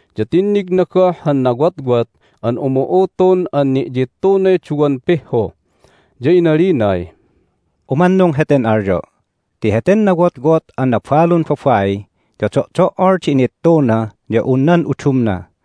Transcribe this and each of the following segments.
ya tinnigna goh han nawotwot an umu'utun an ni'yittunay duwan pihhu. Ya inalinay, "Umannung heten alyo' ti heten nawotwot an nabalun babai ya do'do"ol di inittuna ya un nan udumna!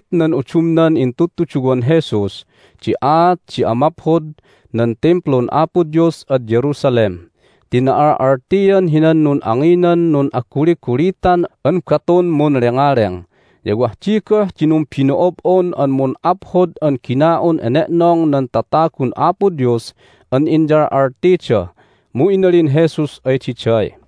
Hinahapit nan udumnan intudtuduwan Jesus di aat di amaphod nan Timplun Apo Dios ad Jerusalem ti na'al'altian hinan nun'anginan nun'aguligulitan an batun munlengaleng, ya wah di goh di numbino'ob'on an mun'aphod an gina'un ene'nong nan tatagun Apo Dios an inyal'altida. Mu inalin Jesus ay diday,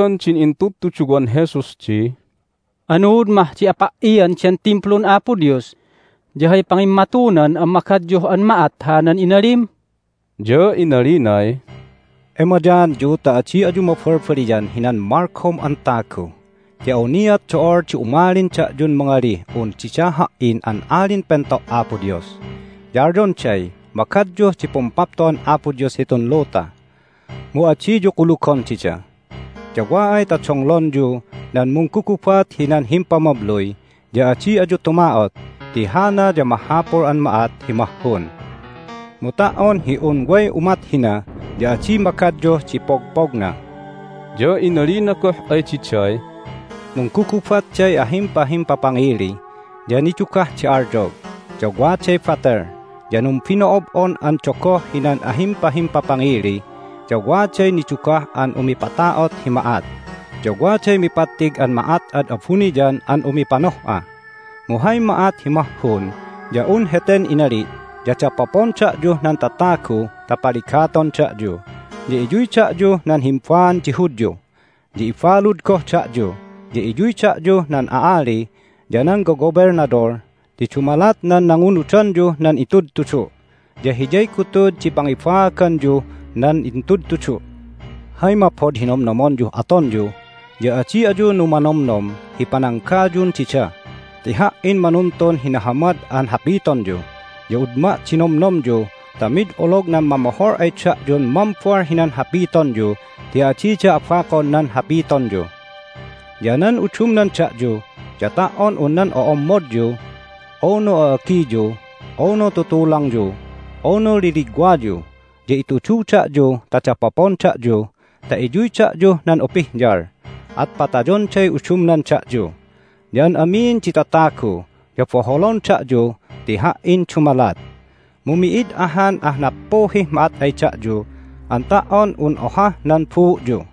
Imbagan din intudtuduwan Jesus di, "Anuud mah di apa"ian den Timplun Apo Dios, ya hay pangimmatunan an magadyuh an ma'at hanan inalim?" Ya inalinay, "Emayaanyu ta adi ayu mabalbaliyan hinan malgom an tagu! Ti awniat do'ol di umalin da'yun mangalih un dida Ha"in an Alin Pento' Apo Dios, ya alyonday magadyuh di Pumpapto'an Apo Dios hitun luta! Mu adiyu kulugon dida. Ya wa ay ta donglonyu nan munggugubat hinan himpamabluy ya adi ayu tuma'ot ti hana ya mahapul an ma'at hi mahhun. Mu ta"on hi un way umat hina ya adi magadyuh di pogpogna." Ya inalina goh ay diday, "Munggugubatday ahimpahimpapangili, ya nidugah di alyog, ya waday batel, ya numbino'ob'on an dogoh hinan ahimpahimpapangili, ya waday nidugah an umipata'ot hi ma'at, ya waday mipattig an ma'at ad abuniyan an umipanoh'a. Mu hay ma'at hi mahhun ya un heten inali' ya dapopon da'yuh nan tatagu ta paligaton da'yu, ya iyuy da'yuh nan himba'an di Hudyu, ya ibalud goh da'yu, ya iyuy da'yuh nan a'ali ya nan gogobelnadol ti dumalat nan nangunudanyuh nan itudtudu'. Ya hiyay gutud di pangibaaganyuh nan intudtudu'. Hay maphod hi nomnomonyuh atonyu ya adi ayu numanomnom hi pananggayun dida ti Ha"in manuntun hi nahamad an hapitonyu. Ya udma' di nomnomyu ta mid olog nan mamohol ay da'yun mambal hinan hapitonyu ti adida abakon nan hapitonyu. Ya nan udumnan da'yu ya ta"on un nan o'ommodyu, unu a'agiyu, unu tutulangyu, unu liligwayu ya itudu da'yu ta dapopon da'yu ta iyuy da'yuh nan upihyal, at patayonday udumnan da'yu. Ya an amin di tatagu ya boholon da'yu ti Ha"in dumalat, mu mi'id ahan ah nappuhih ma'at ay da'yu an ta"on un ohah nan buu'yu.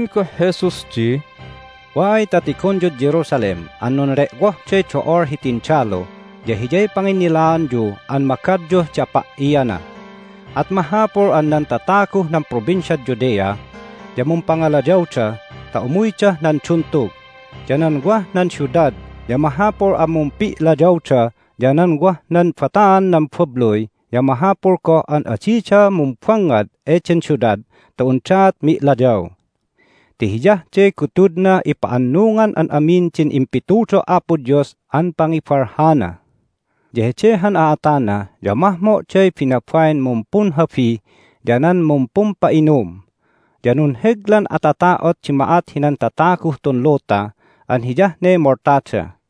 Inalin goh Jesus di, "Wa ay ta tigonyud Jerusalem an nunle'wohday do'ol hi tindalu ya hiyay panginnilaanyu an magadyuh di apa"iana. At mahapul an nan tataguh nan Provinciad Judea ya mumpangalayawda ta umuydah nan duntug, ya nan wah nan siudad ya mahapul an mumpi'layawda, ya nan wah nan bataan nan babluy ya mahapul goh an adida mumbangngad eden siudad ta undaat mi'layaw. Ti hiyah de gutudnah ipa'annungan an amin din impitudo' Apo Dios an pangibalhana. Ya hede han a'atana ya mahmo'day binabain mumpunhabi ya nan mumpumpa'inum! Ya nunheglan atata'ot di ma'at hinan tataguh tun luta an hiyah ne moltada.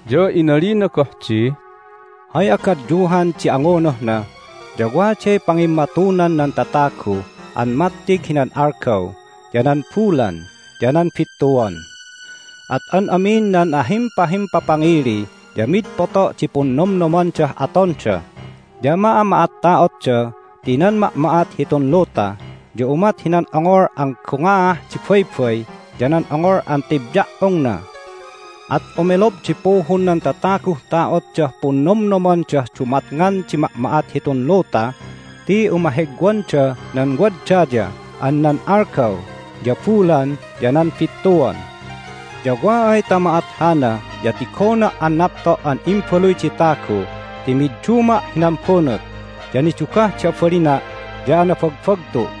Ya inalina goh di, "Hay agadyuhan di angunuhna ya waday pangimmatunan nan tatagu an mattig hinan algaw, ya nan bulan, ya nan bittuan. At an amin nan ahimpahimpapangili ya mid poto' di punnomnomandah atonda, ya ma'ama'atta'otda ti nan ma'ma'at hitun luta ya umat hinan ongol an gongaah di baybay ya nan ongol an tebya"ongna. At umelob di puhun nan tataguh ta'otdah punnomnomandah dumatngan di ma'ma'at hitun luta ti umahegwanda nan wad daya an nan algaw, ya bulan, ya nan bittuan. Ya wa ay ta ma'at hana ya tigona' an napto' an Imbaluy di Tagu ti midduma' hinan bunut, ya nidugah di abalina' ya anabagbagtu'.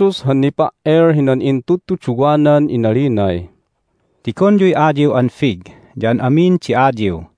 Inulgud Jesus han nipa"el hinan intudtuduwanan inalinay, "Tigonyuy ayiw an fig ya an amin di ayiw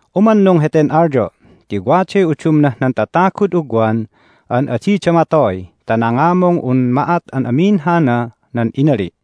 Umannung heten alyo' ti waday udumnah nan tatagud ugwan an adida matoy ta nangamung un ma'at an amin hana nan inali'.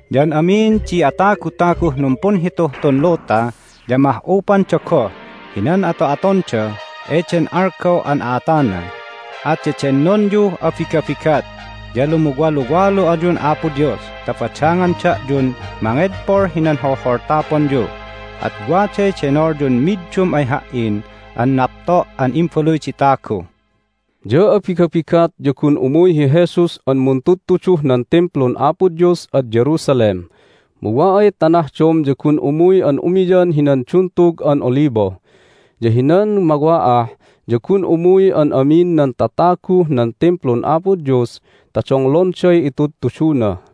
Ya an amin di atagutaguh numpunhituh tun luta ya ma'ah'upanda goh hinan ato'atonda eden algaw an a'atana. At dedennonyuh abigabigat, ya lumuwaluwalu ayun Apo Dios ta badangan da'yun mangedpol hinan holholtaponyu, at waday denolyun middum ay Ha"in an napto' an Imbaluy di Tatagu." Ya abigabigat ya gun umuy hi Jesus an muntudtuduh nan Timplun Apo Dios ad Jerusalem, mu wa ay ta nahdom ya gun umuy an umiyan hinan Duntug an Olibo. Ya hinan mawa'ah ya gun umuy an amin nan tataguh nan Timplun Apo Dios ta donglonday itudtuduna.